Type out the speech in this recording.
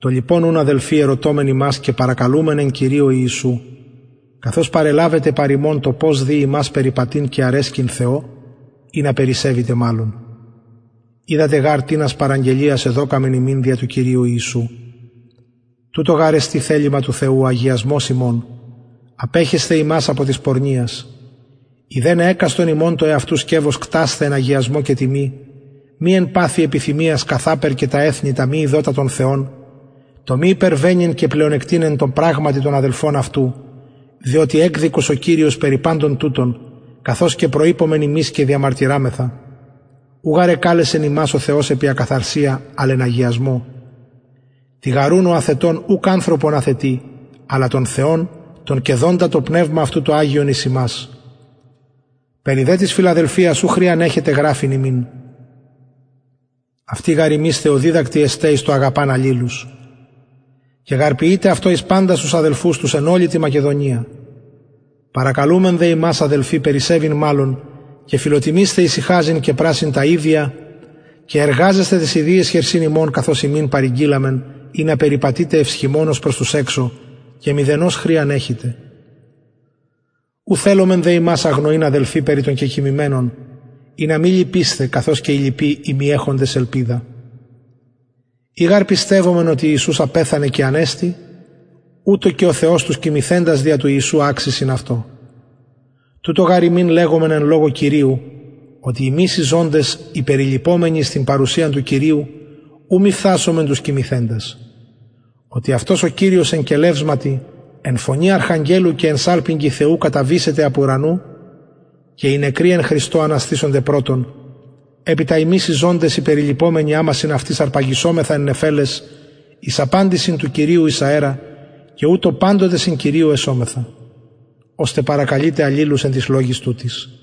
λοιπον ουν αδελφοι ερωτωμεν υμας και παρακαλουμεν εν κυριω ιησου καθως παρελαβετε παρ ημων το πως δει υμας περιπατειν και αρεσκειν θεω ινα περισσευητε μαλλον οιδατε γαρ τινας παραγγελιας εδωκαμεν υμιν δια του κυριου ιησου τουτο γαρ εστιν θελημα του θεου ο αγιασμος υμων απεχεσθαι υμας απο της πορνειας ειδεναι εκαστον υμων το εαυτου σκευος κτασθαι εν αγιασμω και τιμη μη εν παθει επιθυμιας καθαπερ και τα εθνη τα μη ειδοτα τον θεον το μη υπερβαινειν και πλεονεκτειν εν τω πραγματι τον αδελφον αυτου διοτι εκδικος ο κυριος περι παντων τουτων καθως και προειπομεν υμιν και διεμαρτυραμεθα ου γαρ εκαλεσεν ημας ο θεος επι ακαθαρσια αλλ εν αγιασμω τοιγαρουν ο αθετων ουκ ανθρωπον αθετει αλλα τον θεον τον και δοντα το πνευμα αυτου το αγιον εις υμας περι δε της φιλαδελφιας ου χρειαν εχετε γραφειν υμιν αυτοι γαρ υμεις θεοδιδακτοι εστε εις το αγαπαν αλληλους και γαρ ποιειτε αυτο εις παντας τους αδελφους τους εν ολη τη μακεδονια παρακαλουμεν δε υμας αδελφοι περισσευειν μαλλον και φιλοτιμεισθαι ησυχαζειν και πρασσειν τα ιδια και εργαζεσθαι ταις ιδιαις χερσιν υμων καθως υμιν παρηγγειλαμεν ινα περιπατητε ευσχημονως προς τους εξω και μηδενος χρειαν εχητε ου θελομεν δε υμας αγνοειν αδελφοι περι των κεκοιμημενων ινα μη λυπησθε καθως και οι λοιποι οι μη εχοντες ελπιδα ει γαρ πιστευομεν οτι ιησους απεθανεν και ανεστη ουτως και ο θεος τους κοιμηθεντας δια του ιησου αξει συν αυτω τουτο γαρ υμιν λεγομεν εν λογω κυριου οτι ημεις οι ζωντες οι περιλειπομενοι εις την παρουσιαν του κυριου ου μη φθασωμεν τους κοιμηθεντας οτι αυτος ο κυριος εν κελευσματι εν φωνη αρχαγγελου και εν σαλπιγγι θεου καταβησεται απ ουρανου και οι νεκροι εν χριστω αναστησονται πρωτον επειτα ημεις οι ζωντες οι περιλειπομενοι αμα συν αυτοις αρπαγησομεθα εν νεφελαις εις απαντησιν του κυριου εις αερα και ουτως παντοτε συν κυριω εσομεθα ωστε παρακαλειτε αλληλους εν τοις λογοις τουτοις